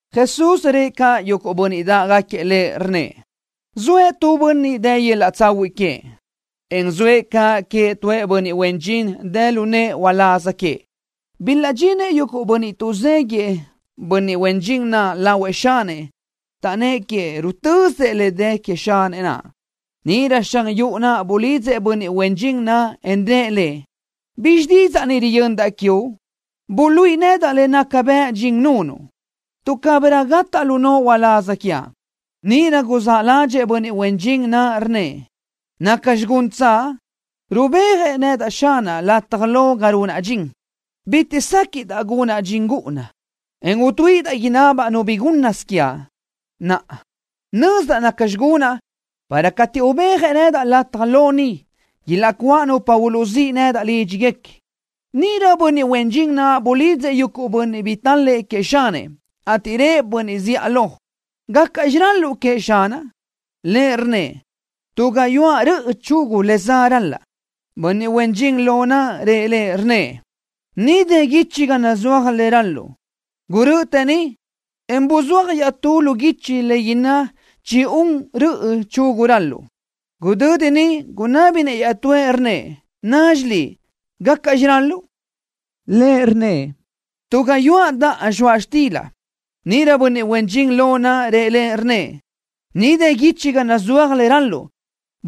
Jesús rëʼ caʼ yuguʼ bönniʼ dáʼgaquiëʼ Lëʼ, rnnëʼ: —Zoëʼ tu bönniʼ dë yöl-laʼ tsahuiʼ queëʼ, en zoëʼ caʼ queëʼ tuëʼ bönniʼ huen dxin dë lu nëʼë uláz queëʼ. Bilaʼdxinëʼ yuguʼ bönniʼ tuʼzéguiëʼ bönniʼ huen dxin naʼ lahuëʼ xanëʼ, taʼnnë́ʼ queëʼ rutösëʼ le dë queëʼ xanëʼ naʼ. Níʼirö xan yuʼu naʼ bulidzëʼ bönniʼ huen dxin naʼ, en rëʼ lëʼ: “¿Bizxi didzaʼ ni riyöndaʼ quiuʼ? Buluíʼi nedaʼ le naca bëʼ dxin nunuʼ, tuʼ cabirö gataʼ lu noʼo uláz quiaʼ.” Níʼirö guzáʼ ládxëʼë bönniʼ huen dxin naʼ, rnnëʼ: ¿Nacxi guntsaʼ? Rubéajëʼ xanaʼ nedaʼ lataj lo ga runaʼ dxin. Bitiʼ séquiʼdaʼ gunaʼ dxin gúʼuna, en utuíʼidaʼ inabaʼ nu bi gúnnasö quiaʼ. Naʼa nözdaʼ naca gunaʼ para cateʼ ubéajëʼ nedaʼ lataj lo ni, ilaʼcuáʼ nupa uluʼzíʼ nedaʼ lídxiguequi. Níʼirö bönniʼ huen dxin naʼ bulidzëʼ yuguʼ bönniʼ bi tál-lëʼë queëʼ xanëʼ, ateʼ rëʼ bönniʼ zíʼalö: “¿Gácaʼxi ral-luʼu queëʼ xanaʼ?” Lëʼ rnnëʼ: “Tu gayuáʼ röʼö chugu le za ral-laʼa.” Bönniʼ huen dxin lo naʼ rëʼ lëʼ, rnnëʼ: “Ni dë guichi ga nazúaj le ral-luʼu. Gurö́ʼötë ni, en buzúaj iaʼtú lu guichi le inná chi-un röʼö chugu ral-luʼu.” Gudödi niʼ gunábinëʼ iaʼtúëʼ, rnnëʼ: “Nazxi liʼ, ¿gácaʼxi ral-luʼu?” Lëʼ rnnëʼ: “Tu gayuáʼ daʼa zxoaʼ xtila.” Níʼirö bönniʼ huen dxin lo naʼ rëʼ lëʼ, rnnëʼ: “Ni dë guichi ga nazúaj le ral-luʼu.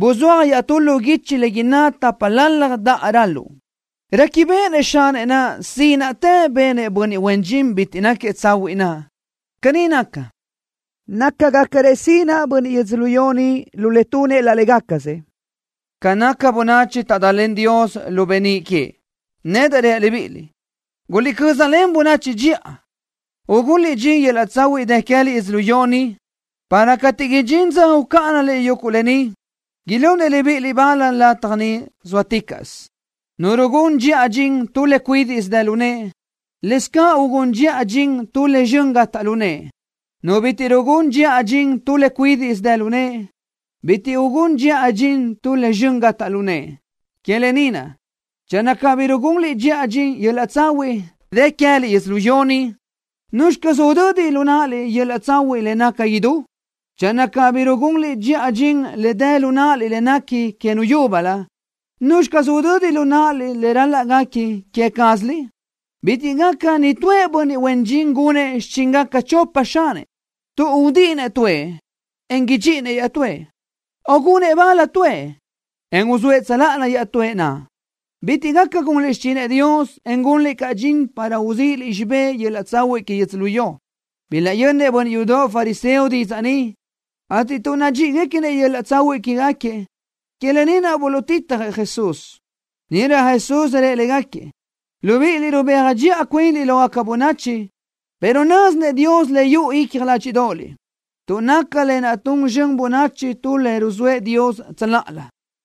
Buzúaj iaʼtú lu guichi le inná tápalalaj daʼa ral-luʼu.” Réquibeʼenëʼ xanëʼ naʼ sínaʼtë benëʼ bönniʼ huen dxin bitiʼ náquiëʼ tsahuiʼ naʼ. Caní naca, nácagacarëʼ sinaʼ bönniʼ yödzölió ni lu le tunëʼ laʼ légacasëʼ, ca nácagaca bönachi taʼdalen Dios lu beníʼ queëʼ. ’Nedaʼ reaʼ libíʼiliʼ: Guliʼcö́zalen bönachi dxiʼa, ugunliʼ dxin yöl-laʼ tsahuiʼ dë queë́liʼ yödzölió ni, para cateʼ idxín dza ucáʼanaliʼ yuguʼ lë ni, ilunëʼ libíʼiliʼ bal lataj niʼ zóaticaʼsö. ’Nu rugún dxiʼa dxin tu le cuídiʼsö dë lu nëʼe, lëscaʼ ugún dxiʼa dxin tu le zxön gataʼ lu nëʼe. Nu bitiʼ rugún dxiʼa dxin tu le cuídiʼsö dë lu nëʼe, bitiʼ ugún dxiʼa dxin tu le zxön gataʼ lu nëʼe. Que lë ni naʼ, channö cabí rugunliʼ dxiʼa dxin yöl-laʼ tsahuiʼ dë queë́liʼ yödzölió ni, ¿nuzxi caz udödi lu náʼaliʼ yöl-laʼ tsahuiʼ le naca idú? Channö cabí rugunliʼ dxiʼa dxin le dë lu náʼaliʼ le nequi que nu yúbölö, ¿nuzxi caz udödi lu náʼaliʼ le ral-laʼ guequi que quéziliʼ? ’Bitiʼ gaca nitúëʼ bönniʼ huen dxin gunëʼ xichíngaca chopa xanëʼ, tuʼ udíʼinëʼ tuëʼ, en idxíʼinëʼ iaʼtúëʼ, o gunëʼ bal tuëʼ, en uzóëʼ tsöláʼalö iaʼtúëʼ naʼ. Bitiʼ gaca gunliʼ xichinëʼ Dios, en gunliʼ caʼ dxin para uzíʼiliʼ xibé yöl-laʼ tsahuiʼ que yödzölió. Bilaʼyönnëʼ bönniʼ yudoʼ fariseo didzaʼ ni, ateʼ tuʼ nadxíʼiguequinëʼ yöl-laʼ tsahuiʼ quégaquiëʼ, que lë ni naʼ buluʼtitjëʼ Jesús. Níʼirö Jesús rëʼ légaquiëʼ: —Libíʼiliʼ rubéaj dxiʼa cuinliʼ lógaca bönachi, pero nö́zinëʼ Dios le yuʼu icja ládxiʼdoʼoliʼ, tuʼ naca lë naʼ tun zxön bönachi tu le ruzóëʼ Dios tsöláʼalö.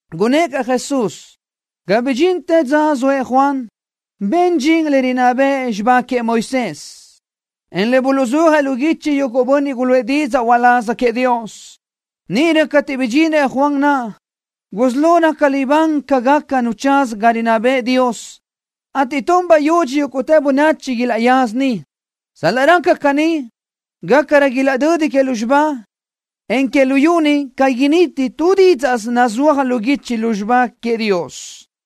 Gunnë́ʼ caʼ Jesús: —Ga bidxintë dza zoëʼ Juan, ben dxin le rinná bëʼ xibá queëʼ Moisés, en le buluʼzúajëʼ lu guichi yuguʼ bönniʼ guluʼë didzaʼ uláz queëʼ Dios. Níʼirö cateʼ bidxinëʼ Juan naʼ, gusí lo raca libán ca gaca nu tsaza ga rinná bëʼë Dios, ateʼ tun bayudxi yúguʼtë bönachi ilaʼyaza niʼ. ’Sal-laʼ raca caní, gácarö ilaʼdödi que lúzxiba, en que luyú ni ca initi tu dídzaʼsö nazúaj lu guichi lu xibá queëʼ Dios.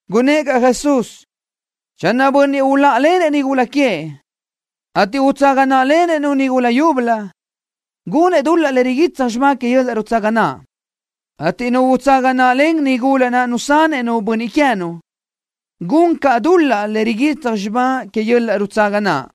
Gunnë́ʼ caʼ Jesús: —Channö tu bönniʼ uláʼalenëʼ nigula queëʼ, ateʼ utsaga náʼalenëʼ-nu nigula yúbölö, gunëʼ dul-laʼ le riguitsaj xibá que yöl-laʼ nutsaga naʼ, ateʼ nu utsaga náʼalen nigula naʼ nusanëʼ-nu bönniʼ queë́nu, gun caʼ dul-laʼ le riguitsaj xibá que yöl-laʼ nutsaga naʼ.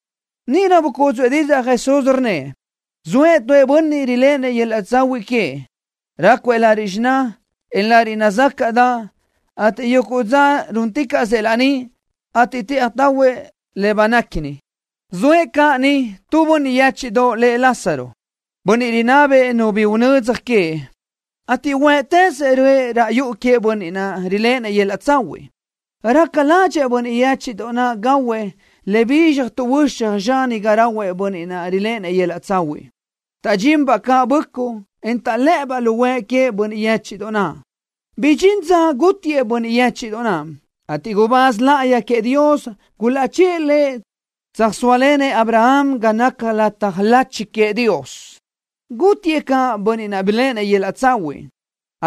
Níʼirö bucúdzuʼë didzaʼ Jesús, rnnëʼ: —Zoëʼ tu bönniʼ riléʼenëʼ yöl-laʼ tsahuiʼ queëʼ. Rácuëʼ lariʼ xiná, en lariʼ nazácaʼdaʼ, ateʼ yuguʼ dza rúnticaʼsëʼ laní, ateʼ tëʼaj tahuëʼ le banéquini. Zoëʼ caʼ niʼ tu bönniʼ yéchiʼdoʼ lëʼ Lázaro, bönniʼ rinabëʼ nu bi unödzaj queëʼ, ateʼ huë́ʼtëzëʼ röʼë raʼ yuʼu queëʼ bönniʼ naʼ riléʼenëʼ yöl-laʼ tsahuiʼ. Raca ládxëʼë bönniʼ yéchiʼdoʼ naʼ gahuëʼ le bizxaj tuʼhuöxaj zxani ga rahuëʼ bönniʼ naʼ riléʼenëʼ yöl-laʼ tsahuiʼ. Taʼdxinbaʼ caʼ böʼcuʼ, en taʼlë́ʼëbaʼ lu huëʼ queëʼ bönniʼ yéchiʼdoʼ naʼ. Bidxín dza gútiëʼ bönniʼ yéchiʼdoʼ naʼ, ateʼ gubáz láʼayi queëʼ Dios gulaʼchë́ʼë lëʼ tsöjsóalenëʼ Abraham ga naca lataj lachi queëʼ Dios. Gútiëʼ caʼ bönniʼ naʼ biléʼenëʼ yöl-laʼ tsahuiʼ,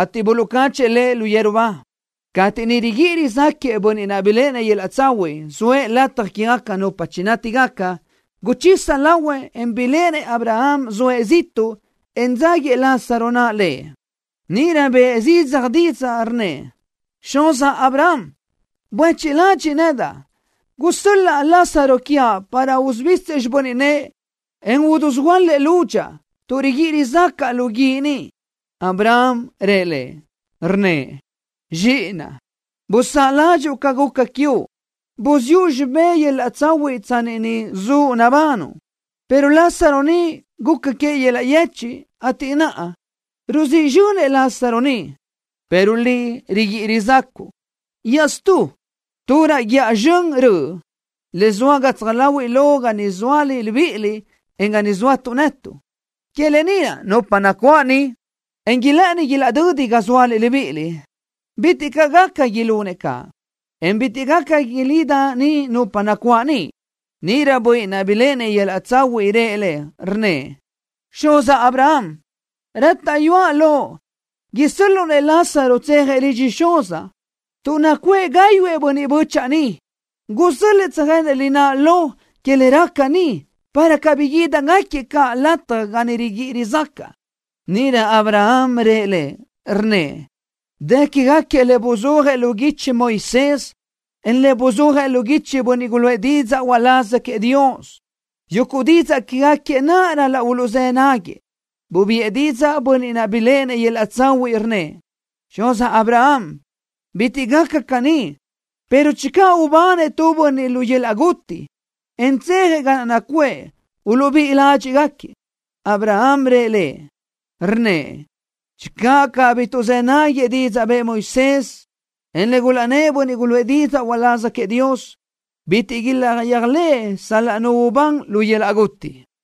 ateʼ buluʼcáchëʼë lëʼ yeru ba. Cateʼ niʼ riguíʼi rizáquëʼë bönniʼ naʼ biléʼenëʼ yöl-laʼ tsahuiʼ, zoëʼ lataj quégaca nupa nátigaca, guchisa lahuëʼ, en biléʼenëʼ Abraham zoëʼ ziʼtuʼ, en dzáguiëʼ Lázaro naʼ lëʼ. Níʼirö bëʼë zidzaj didzaʼ, rnnëʼ: “Xuzaʼ, Abraham, buéchiʼ ladxiʼ nedaʼ. Gusö́l-laʼ Lázaro quiaʼ para usubisëʼ xibö́n nëʼë, en udusuhuöálëʼ lúdxaʼa, tuʼ riguíʼi rizácaʼa lu guíʼ ni.” Abraham rëʼ lëʼ, rnnëʼ: “Zxíʼinaʼ, busáʼ ládxuʼu ca guca quiuʼ, buziʼu xibé yöl-laʼ tsahuiʼ tsanni niʼ zuʼ nabanuʼ, pero Lázaro ni, guca queëʼ yöl-laʼ yechiʼ, ateʼ naʼa, ruzíʼ zxönëʼ Lázaro ni, pero liʼ riguíʼi rizácuʼu. Iaʼstú, tu raʼ guíʼa sibi röʼ, le zoa gatsaj láhuiʼlö ga niʼ zóaliʼ libíʼiliʼ, en ga ni zóatuʼ netuʼ. Que lë ni naʼ nupa nacuáʼ ni, en ilë́ʼëni ilaʼdödi ga zóaliʼ libíʼiliʼ, bitiʼ caʼ gaca ilunëʼ caʼ, en bitiʼ gaca ilida ni nupa nacuáʼ niʼ.” Níʼirö bönniʼ naʼ biléʼenëʼ yöl-laʼ tsahuiʼ rëʼ lëʼ, rnnëʼ: “Xuzaʼ Abraham, rátaʼyuaʼ loʼ isö́l-luʼu-nëʼ Lázaro tsejëʼ lidxëʼ xuzaʼ, tuʼ nacuʼë gáyuʼë bönniʼ bö́chaʼa niʼ. Gusö́l-lëʼë tsöjenëʼ lináʼ lo que le raca ni, para cabí guídigaquiëʼ caʼ lataj ga ni riguíʼi rizácaʼa.” Níʼirö Abraham rëʼ lëʼ, rnnëʼ: “Dë quégaquiëʼ le buzúajëʼ lu guichi Moisés, en le buluʼzúajëʼ lu guichi bönniʼ guluʼë didzaʼ uláz queëʼ Dios. Yuguʼ didzaʼ quégaquiëʼ naʼ ral-laʼ uluʼzë́ náguiëʼ.” Bubiʼë didzaʼ bönniʼ naʼ biléʼenëʼ yöl-laʼ tsahuiʼ, rnnëʼ: “Xuzaʼ Abraham, bitiʼ gaca caní, pero channö ubanëʼ tu bönniʼ lu yöl-laʼ guti, en tsejëʼ ga naʼ nacuʼë, uluʼbíʼi ládxiʼgaquiëʼ.” Abraham rëʼ lëʼ, rnnëʼ: “Channö cabí tuʼzë́ náguiëʼ didzaʼ bëʼë Moisés, en le gulaʼnnë́ʼ bönniʼ guluʼë didzaʼ uláz queëʼ Dios, bitiʼ ilaʼyéajlëʼë sal-laʼ nu ubán lu yöl-laʼ guti.”